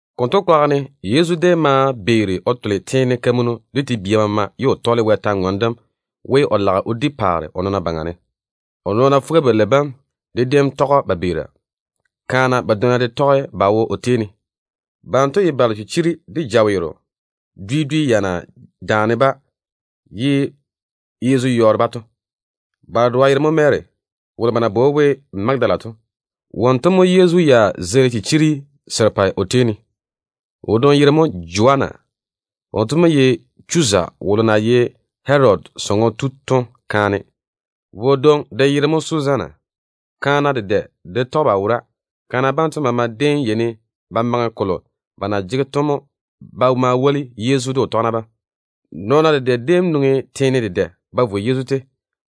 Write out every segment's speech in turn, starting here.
Konto kwaga ne, Yezu déem beeri o tole te-kamunnu de te-balwa maama mo ye o tɔɔle Wɛ paare dem kwor-ywoŋa kam. O nɔɔna fuga-balei bam de déem maa tɔge‑o ba beera. Kaana badwonna de tɔge ba wo o tei ne. Banto ye balo chichiri de jaweero dwi dwi ya na daane-ba ye Yezu yɔɔre-ba to. Ba dedoa yere mo Mary, wolo ba na bwoi we Magadala to. Wonto mo Yezu ya zeili chichiri serepɛ o tei ne. Kaane wodwoŋi yere mo Joanna. Wonto mo ye Chuza wolo na ye Herodi sɔŋɔ tu to kaane. Wodwoŋi de yere mo Suzanna. Kaana dedɛ de tɔge ba wora. Kaana banto maama déem yeini ba maŋe kolo ba na jege to ba maa woli Yezu de o tɔgena bam. Nɔn-kɔgɔ dedɛ déem nwoŋi teene dwi dwi ba vo Yezu tei,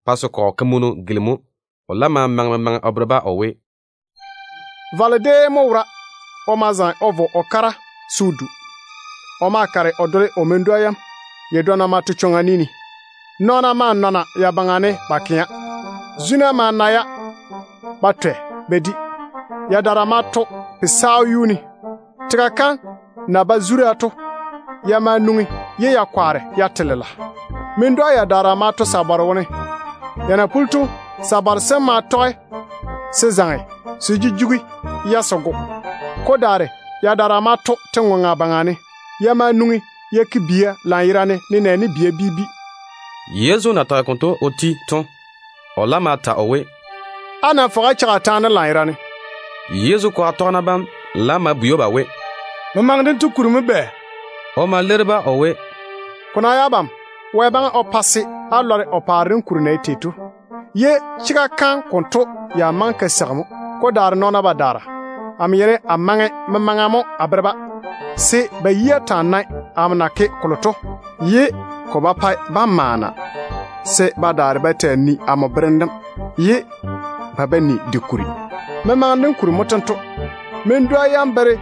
pa se kɔgɔ kamunu gilimi‑o. O laam ma maŋe memaŋe o bere-ba o we: “Valo déem mo wora. O ma zaŋe o vo o kara se o du. O ma kare o dole o men-dwa yam. Yadwonna ma to chwoŋa ni ne. Nɔɔna maa nɔna ya baŋa ne ba kɛa. Zuna ma na-ya ba twɛ ba di. Yadaara ma to kandwa jeiga ne. Tega kam na ba zura to, ya ma nwoŋi ye ya kwaare ya te lela. Men-dwa yadaara ma to sabare wone. Ya na puli to, sabare sem ma tɔge se zaŋe se jujugi-ya se go. Ko daare yadaara ma to te-ŋoŋa baŋa ne. Ya ma nwoŋi ya ke bia lanyerane nenɛɛne bia bi bi.” Yezu na tage konto o ti to, o laam ma ta o we, “Á nam fɔge á cheigi a taane dem lanyerane.” Yezu kwaga tɔgena bam laam ma bwei‑o ba we, “Memaŋe dento kuri mo bɛ?” O ma leiri-ba o we, “Ko ná ye abam, Wɛ maŋe o pa se á lɔre o paare dem kuri na ye tei to, ye chega kam konto ya maŋe ka seigi mo. Ko daare nɔɔna badaara, amo yeini a maŋe memaŋa mo a bere-ba, se ba yia taa nae amo na ke kolo to, ye ko ba pae ba maana, se amo berem dem to ba zwa ne, ye ba ba ni de kuri. Memaŋe dem kuri mo tento: Men-dwa yam bere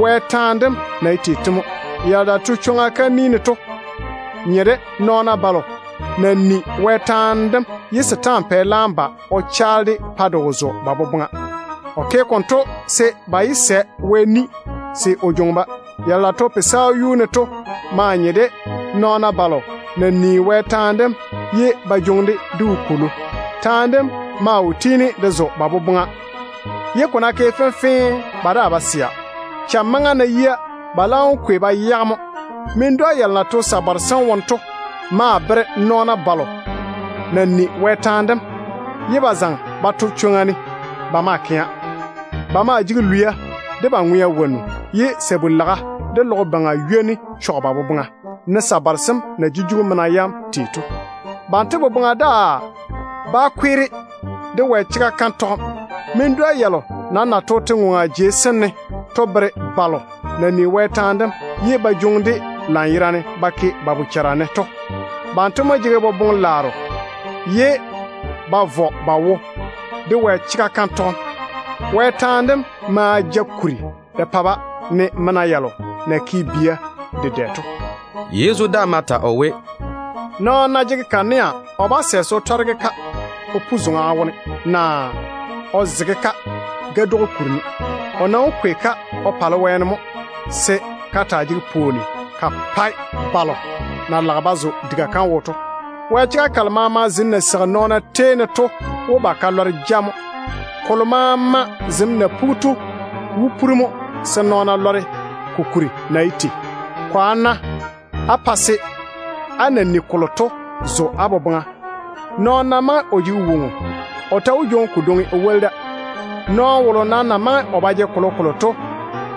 Wɛ taane dem na ye tei to mo. Yalo na to chwoŋa kam ni ne to nye de nɔɔna balo na ni Wɛ taane dem, ye setaana pɛ laam ba o chaale-de pa de wo zo ba boboŋa. O ke konto se ba yé sɛ Wɛ ni se o jwoŋi-ba. Yalo na to kandwa yuu ne to maa nye de nɔɔna balo na ni Wɛ taane dem, ye ba jwoŋi-de de wopwolo. Taane dem maa wo tiini de zo ba boboŋa, ye ko ná ke fenfee, ba daa ba sɛa. Cham maŋa ná yia, ba laam wó kwei ba yage mo. Men-dwa yalo na to sabare sem wone to maa bere nɔɔna balo na ni Wɛ taane dem, ye ba zaŋe ba to chwoŋa ne ba maa kɛa. Ba maa jege lwia de ba ŋwea wonnu, ye sabu-laga de logo baŋa ywoni chɔge ba boboŋa, ne sabare sem na jujugi mena yam tei to. Banto boboŋa daa bá kweere de Wɛ chega kam tɔgem. Men-dwa yalo nam na to te-ŋoŋa jei sem ne to bere balo na ni Wɛ taane dem, ye ba jwoŋi-de lanyerane ba ke ba bochara ne to. Banto mo jege boboŋ-laaro ye ba vɔ ba wo de Wɛ chega kam tɔgem. Wɛ taane dem ma ja kuri de pa-ba, ne mena yalo na ke bia dedɛ to.” Yezu daa ma ta o we, “Nɔɔno ná jege kanea, o bá sɛ se o tɔre-ka o pu zoŋa wone, naa o zege-ka gadwogo kuri ne. O nam wó kwei-ka o pale wɛɛne mo, se ka taa jege pwooni ka pae balo na lage ba zo diga kam wo to. Wɛ chega kalo maama zem na seigi nɔɔna tei ne to wó ba ka lɔre ja mo. Kolo maama zem na pugi to wó puri mo, se nɔɔna lɔre ko kuri na ye tei. Kwaane-na á pa se á na ni kolo to zo á boboŋa. Nɔɔno ná maŋe o jege woŋo, o ta wó jwoŋi kodwoŋi o woli da. Nɔɔno wolo nam na maŋe o ba jege kolokolo to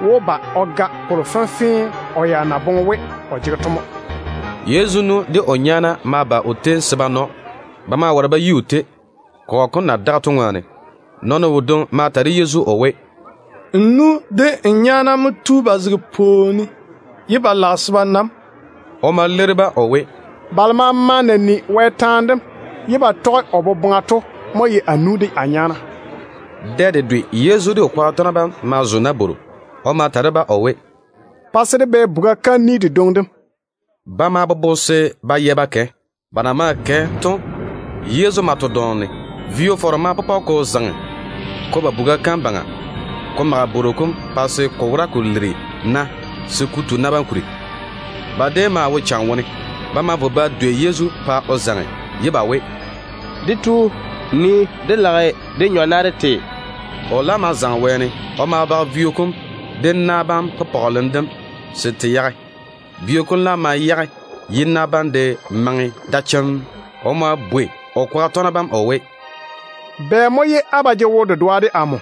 wó ba o ga kolo fenfee o ya na boŋe we o jege to mo.” Yezu nu de o nyaana ma ba o tei se ba na‑o. Ba ma ware ba yi o tei, kɔgɔ kom na daga to ŋwaane. Nɔɔno wodwoŋi ma ta de Yezu o we, “N nu de n nyaana mo tu ba zege pwooni ne, ye ba lage se ba na‑m.” O ma leiri-ba o we, “Balo maama na ni Wɛ taane dem ye ba tɔge o boboŋa to mo ye amo nu de a nyaana.” Dɛ dedwe Yezu de o kwaga tɔgena bam ma zo nabworo. O ma ta de-ba o we, “Pa se dé bɛ buga kam ni dedwoŋi dem.” Ba ma bobo se ba yɛ ba kɛ. Ba na maa kɛ to, Yezu ma to dɔɔm ne. Vo-fɔrɔ ma pɔpɔ ko zaŋe ko ba buga kam baŋa ko mage bworo kom pa se ko wora ko liri na se ko tu na bam kuri. Ba déem maa wo cham wone. Ba ma vo ba dwei Yezu pa o zaŋe, ye ba we, “Dé Tu, nii, dé lage de nyɔ na dé te.” O laam ma zaŋe wɛɛne ye o daare o bage vio kom de na bam we, te yage! Vio kom laam ma yage, ye na bam de maŋe da chemm. O ma bwei o kwaga tɔgena bam o we, “Bɛ mo ye á ba jege wo-dedoa de amo?”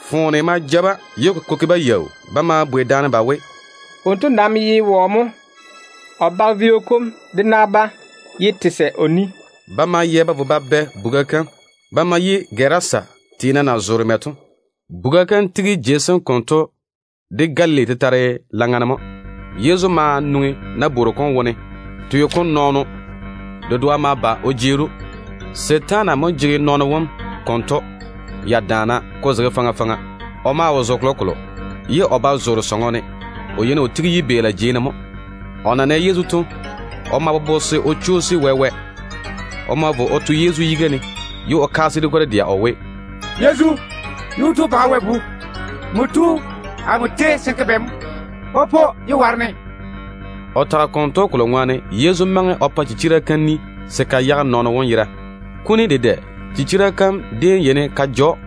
Foone ma ja-ba, ye ko ke-ba yaau. Ba ma bwei daane ba we, “Wonto nam ye wɔ mo? O bage vio kom de na bam ye te sɛ o ni.” Ba ma yɛ ba vo ba bɛ buga kam. Ba ma yi Gerasa tiina na zoore mɛ to. Buga kam tigi jei sem konto de Galili tetare laŋa ne mo. Yezu ma nwoŋi nabworo kom wone. Teo kom nɔɔno dedoa ma ba o jeeri‑o. Setaana mo jege nɔɔno wom konto ya daana ko zege faŋa faŋa. O maa wo zo kolokolo, ye o ba zoore sɔŋɔ ne. O yeini o tigi yibeela jei ne mo. O na nɛ Yezu to, o ma bobo se o chwoosi wɛ-wɛ. O ma vo o to Yezu yiga ne, ye o kaase de kwor-dɛa o we, “Yezu, Yuu-tu Baŋa Wɛ Bu, nmo tu amo tei se n ke bɛ mo? Popo, yé waare-ne.” O tage konto kolo ŋwaane Yezu maŋe o pa chichira kam ni se ka yage nɔɔno wom yera. Kuni dedɛ chichira kam déem yeini ka ja‑o.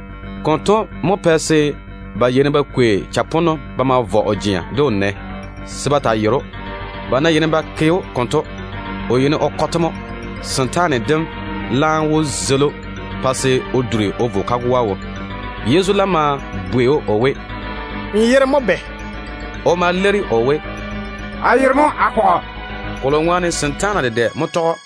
Konto mo pɛ se ba yeini ba kwei chaponno ba ma vɔ o jea de o nɛ, se ba taa yere‑o. Ba ná yeini ba ke‑o konto, o yeini o kɔ-te mo. Setaane dem laam wó zeili‑o pa se o duri o vo kagoa wo. Yezu laam ma bwei‑o o we, “N yere mo bɛ?” O ma leiri o we, “A yere mo Akɔgɔ”, kolo ŋwaane setaana dedɛ mo tɔge‑o.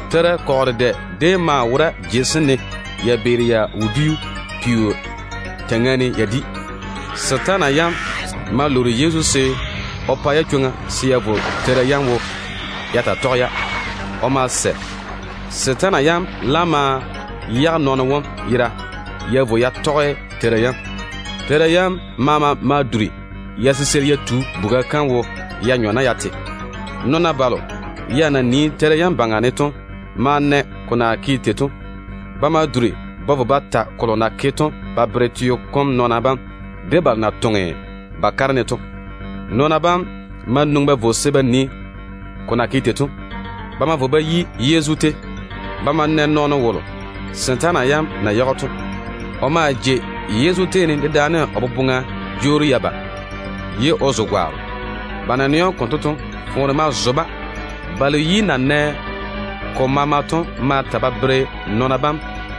Teira kɔgɔ dedɛ déem maa wora jei sem ne ya beeri ya wodiu peo teiŋa ne ya di. Setaana yam ma lwoori Yezu se o pa-ya chwoŋa se ya zo teira yam wone ya taa tɔge-ya. O ma sɛ. Setaana yam laam ma yage nɔɔno wom yera ye ya vo ya tɔge teira yam. Teira yam maama ma duri ya siseiri ya tu buga kam wo ya nyɔ na ya te. Nɔɔna balo ya na yere tera yam to ma na ko na ke tei to. Ba ma duri ba vo ba ta kolo na ke to ba bere teo kom nɔɔna bam de balo na toŋe ba kare ne to. Nɔɔna bam ma nwoŋi ba vo se ba nii ko na ke tei. Ba ma vo ba yi Yezu tei. Ba ma na nɔɔno wolo setaana yam na yage‑o to. O maa jei Yezu tei ne dedaane o boboŋa jwoori ya ba, ye o zo gwaaro. Ba na nɛ‑o konto to, foone ma zo-ba. Balo yi na nɛ ko maama to ma ta ba bere nɔɔna bam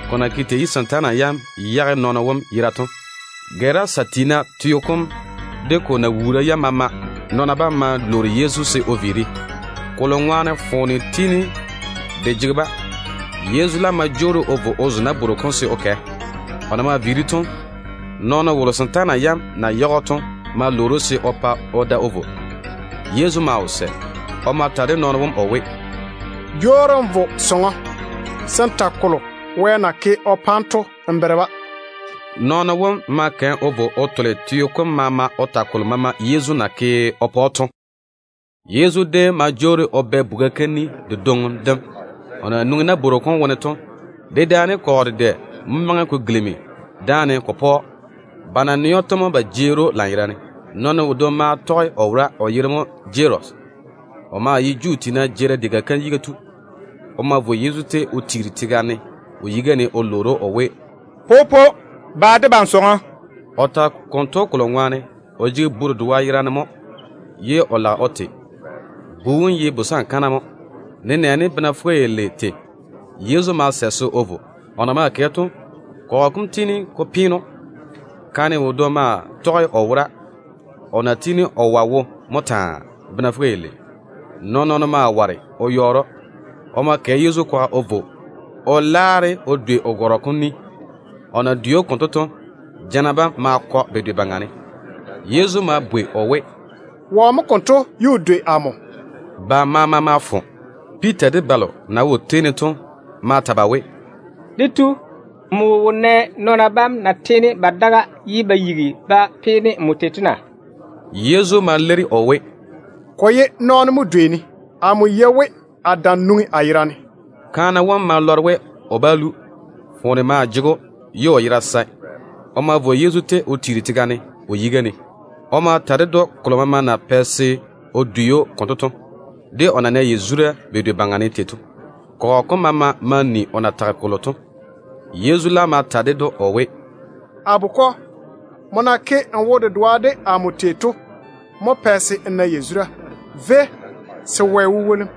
ko na ke tei ye setaana yam yage nɔɔno wom yera to. Gerasa tiina teo kom de ko nawuura yam maama nɔn-bia bam ma lwoori Yezu se o viiri, kolo ŋwaane foone tiini de jege-ba. Yezu laam ma jwoori o vo o zo nabworo kom se o kɛ. O na maa viiri to, nɔɔno wolo setaana yam na yage‑o to ma lwoori‑o se o pa o da o vo. Yezu maa wo sɛ. O ma ta de nɔɔno wom o we, “Jwoori n vo sɔŋɔ se n ta kolo Wɛ na ke o pa nmo to n bere-ba.” Nɔɔno wom ma kɛ o vo o tole teo kom maama o ta kolo Yezu na ke o pa‑o to. Yezu déem ma jwoori o bɛ buga kam ni dedwoŋi dem. O na nwoŋi nabworo kom wone to, dedaane kɔgɔ dedɛ mo maŋe ko gilimi daane ko pɔ‑o. Ba na nɛ‑o to mo ba jeeri‑o lanyerane. Nɔɔno wodwoŋi maa tɔge o wora, o yere mo Jarusi. O maa ye Juu tiina jeerim diga kam yiga tu. O ma vo Yezu tei o tiiri tega ne o yiga ne o lwoori‑o o we, “Popo, ba debam sɔŋɔ.” O tage konto kolo ŋwaane o jege bu dedoa yerane mo ye o lage o te. Bu wom ye busankana mo, nenɛɛne bena fuga-yalei tei. Yezu ma sɛ se o vo. O na maa kɛ to, kɔgɔ kom tiini ko peene‑o. Kaane wodwoŋi maa tɔge o wora, o na tiini o wɔe wo mo taa, bena fuga-yalei. Nɔɔn-nɔɔno maa ware o yɔɔre‑o. O ma kɛ Yezu kwaga o vo o laare o dwei o gɔrɔ kom ni. O na dwei‑o konto to, jana bam ma kɔ bedwe baŋa ne. Yezu ma bwei o we, “Wɔ mo konto ye o dwei amo?” Ba maama ma fo. Piita de balo na wo o tei ne to ma ta ba we, “Dé Tu, nmo wo nɛ nɔɔna bam na tiini ba daga ye ba yigi ba peene nmo tei to na?” Yezu ma leiri o we, “Ko ye nɔɔno mo dwei-ne. Amo yei we a dam nwoŋi a yera ne.” Kaane wom ma lɔre we o bá lu. Foone maa jege‑o ye o yera sae. O ma vo Yezu tei o tiiri tega ne o yiga ne. O ma ta ded‑o kolo maama na pɛ se o dwei‑o konto to, de o na nɛ yazura bedwe baŋa ne tei to. Kɔgɔ kom maama ma ni o na tage kolo to. Yezu laam ma ta ded‑o o we, “A bukɔ, nmo na ke n wo-dedoa de amo tei to mo pɛ se n na yazura. Véi, se Wɛ wó pa‑m yazura.”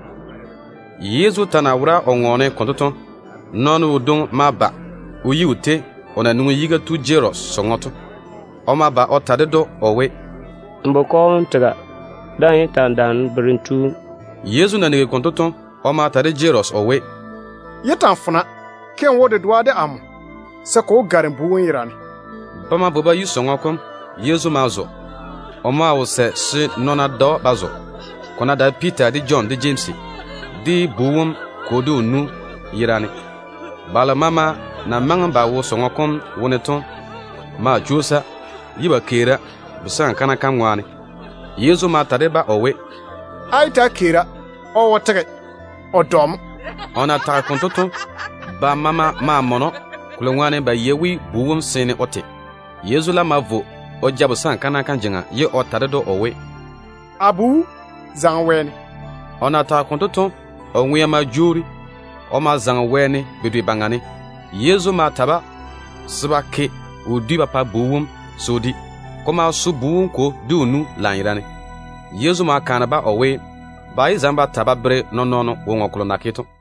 Yezu ta na wora o ŋɔɔne konto to, nɔɔno wodwoŋi ma ba o yi o tei, o na nwoŋi yiga tu Jarusi sɔŋɔ to. O ma ba o ta ded‑o o we, “N bukɔ wom tega. Daa‑n yé ta‑n daane berem tu wom.” Yezu na nigi konto to, o ma ta de Jarusi o we, “Yé ta‑n fona. Ke n wo-dedoa de amo, se ko wó gare bu wom yera ne.” Ba ma vo ba yi sɔŋɔ kom. Yezu ma zo. O maa wo sɛ se nɔɔna da‑o ba zo, ko ná dae Piita, de Jɔn, de Jemsi, de bu wom kwo, de o nu yerane. Balo maama na maŋe ba wo sɔŋɔ kom wone to maa chwoosa, ye ba keera busankana kam ŋwaane. Yezu ma ta de-ba o we, “Á yé ta‑á keera. O wo tege, o dɔ mo.” O na tage konto to, ba maama ma mɔne‑o, kolo ŋwaane ba yei we bu wom seene o te. Yezu laam ma vo o ja busankana kam jeŋa, ye o ta de-ka o we, “A bu, zaŋe wɛɛne.” O na tage konto to, o ŋwea ma jwoori. O ma zaŋe wɛɛne bedwe baŋa ne. Yezu ma ta-ba se ba ke wodiu ba pa bu wom se o di. Ko ma so bu wom kwo de o nu lanyerane. Yezu ma kaane-ba o we, ba yé zaŋe ba ta ba bere nɔɔn-nɔɔno woŋo kolo na ke to.